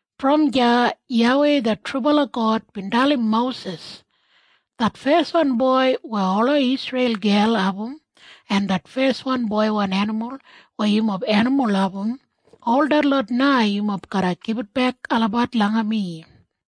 Brom deya YAWEI det trubala God bin dalim Mosis, “Det feswan boi weya ola Isreil gel abum en det feswan boiwan enimul weya yumob enimul abum, ol detlot na yumob garra gibitbek olabat langa mi.”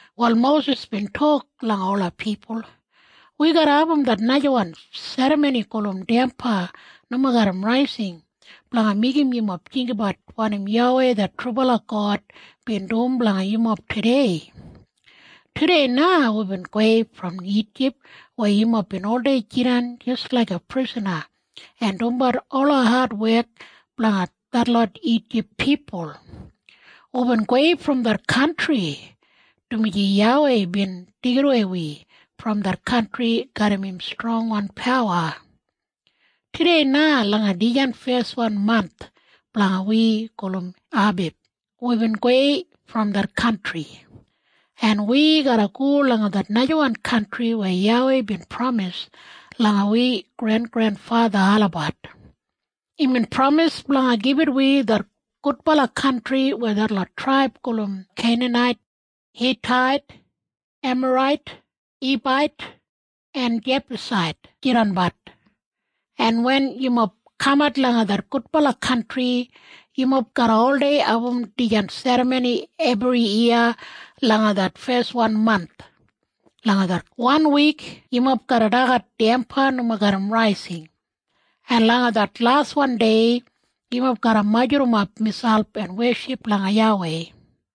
Wal Mosis bin tok langa ola pipul, “Wi garra abum det najawan serramoni gulum Damba Nomo Garram Raising blanga meigim yumob jinggabat wanim YAWEI det trubala God bin dum blanga yumob tudei. Tudei na wibin gowei brom Ijip weya yumob bin oldei jidan jis laiga prisana en dumbat ola adwek blanga detlot Ijip pipul. Wibin gowei brom det kantri, dumaji YAWEI bin deigidawei wi brom det kantri garram im strongwan pawa. Tudei na langa dijan feswan manth blanga wi gulum Abib wibin gowei brom det kantri, en wi garra go langa det najawan kantri weya YAWEI bin pramis langa wi grengrenfatha olabat. Imbin pramis blanga gibit wi det gudbala kantri weya detlot traib gulum Keinanait, Hitait, Emarait, Hibait en Jebusait jidanbat. En wen yumob kamat langa det gudbala kantri, yumob garra oldei abum dijan serramoni ebriyiya langa det feswan manth. Fo wanwik yumob garra dagat damba nomo garram raising, en langa det laswan dei yumob garra majurrumap miselp en weship langa YAWEI.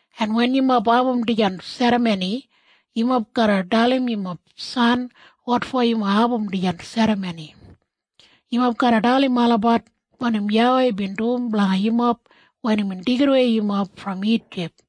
En wen yumob abum dijan serramoni, yumob garra dalim yumob san wotfo yumob abum dijan serramoni. Yumob garra dalim olabat wanim YAWEI bin dum blanga yumob wen imbin deigidawei yumob brom Ijip.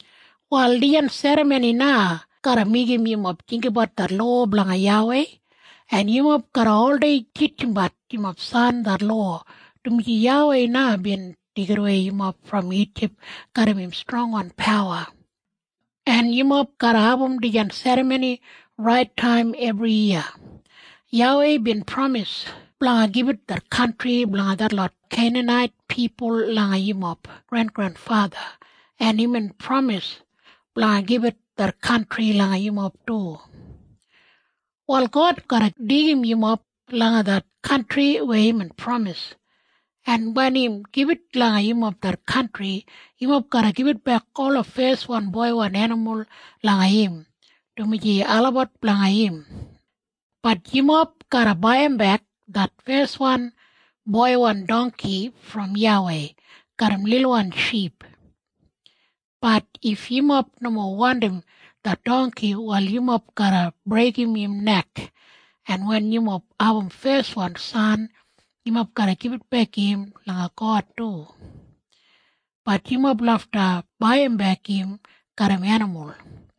“Wal dijan serramoni na garra meigim yumob jinggabat det lowa blanga YAWEI, en yumob garra oldei titjimbat yumob san det lowa, dumaji YAWEI na bin deigidawei yumob brom Ijip garram im strongwan pawa. En yumob garra abum dijan serramoni rait taim ebriyiya. YAWEI bin pramis blanga gibit det kantri blanga detlot Keinanait pipul langa yumob grengrenfatha, en imbin pramis blanga gibit det kantri langa yumob du. “Wal God garra deigim yumob langa det kantri weya imbin pramis, en wen im gibit langa yumob det kantri, yumob garra gibitbek ola feswan boiwan enimul langa im, dumaji olabat blanga im. Bat yumob garra baiyimbek det feswan boiwan dongki brom YAWEI garram lilwan ship. Bat if yumob nomo wandim det dongki, wal yumob garra breigim im nek. En wen yumob abum feswan san, yumob garra gibitbek im langa God du. Bat yumob lafta baiyimbek im garram enimul.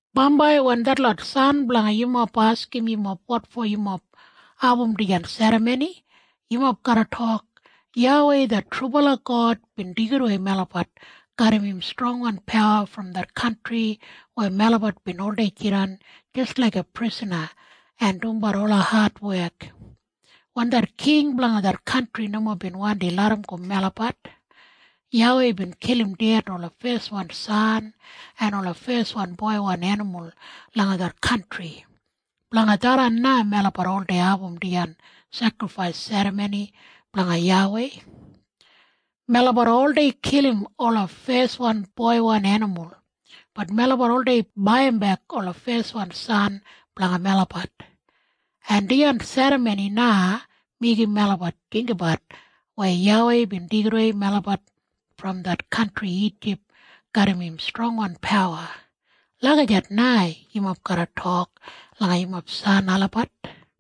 “Bambai wen detlot san blanga yumob askim yumob wotfo yumob abum dijan serramoni, yumob garra tok, ‘YAWEI det trubala God bin deigidawei melabat garram im strongwan pawa brom det kantri weya melabat bin oldei jidan jis laiga prisana en dumbat ola adwek. Wen det king blanga det kantri nomo bin wandi larramgo melabat, YAWEI bin kilim ded ola feswan san en ola feswan boiwan enimul langa det kantri. Blanga tharran na melabat oldei abum dijan sekrifais serramoni blanga YAWEI. Melabat oldei kilim ola feswan boiwan enimul. Bat melabat oldei baiyimbek ola feswan san blanga melabat. En dijan serramoni na meigim melabat jinggabat weya YAWEI bin deigidawei melabat brom det kantri Ijip garram im strongwan pawa.’ Lagijat na yumob garra tok langa yumob san olabat.”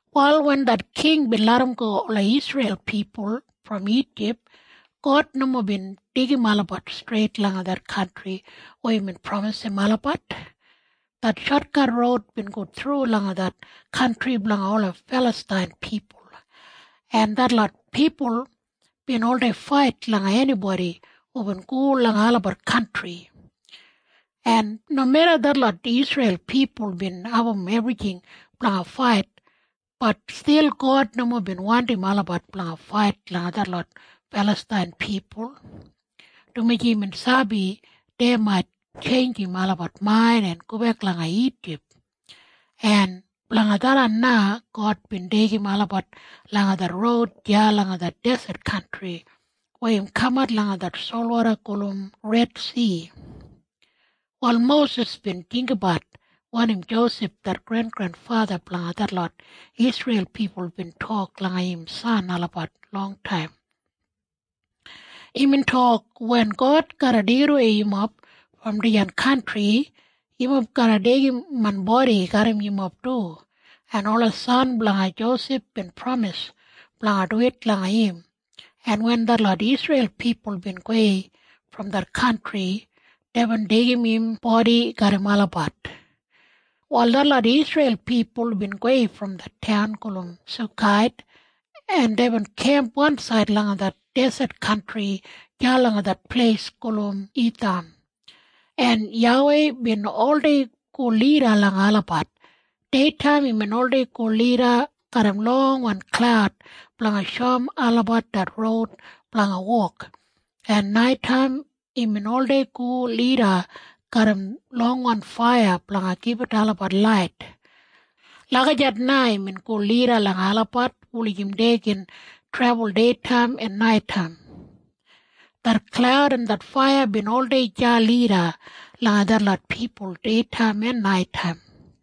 Wal wen det king bin larramgo ola Isreil pipul brom Ijip, God nomo bin deigim olabat streit langa det kantri weya imbin pramisim olabat. Det shotkat roud bin go thru langa det kantri blanga ola Filastain pipul, en detlot pipul bin oldei fait langa enibodi hubin go langa olabat kantri. En nomeda detlot Isreil pipul bin abum ebrijing blanga fait, bat stil God nomo bin wandim olabat blanga fait langa detlot Filastain pipul, dumaji imbin sabi dei mait tjeinjim olabat main en gobek langa Ijip. En blanga tharran na God bin deigim olabat langa det roud deya langa det deset kantri weya im kamat langa det solwoda gulum Redsi. Wal Mosis bin jinggabat wanim Josef det grengrenfatha blanga detlot Isreil pipul bin tok langa im san olabat longtaim. Imbin tok, “Wen God garra deigidawei yumob brom dijan kantri, yumob garra deigim main bodi garram yumob du.” En ola san blanga Josef bin pramis blanga duwit langa im, en wen detlot Isreil pipul bin gowei brom det kantri, deibin deigim im bodi garram olabat. Wal detlot Isreil pipul bin gowei brom det taun gulum Sukait, en deibin kemp wansaid langa det deset kantri deya langa det pleis gulum Itham, en YAWEI bin oldei go lida langa olabat. Deitaim imbin oldei go lida garram longwan klaud blanga shoum olabat det roud blanga wok, en naitaim imbin oldei go lida garram longwan faiya blanga gibit olabat lait. Lagijat na imbin go lida langa olabat wulijim dei gin trebul deitaim en naitaim. Det klaud en det faiya bin oldei deya lida langa detlot pipul deitaim en naitaim.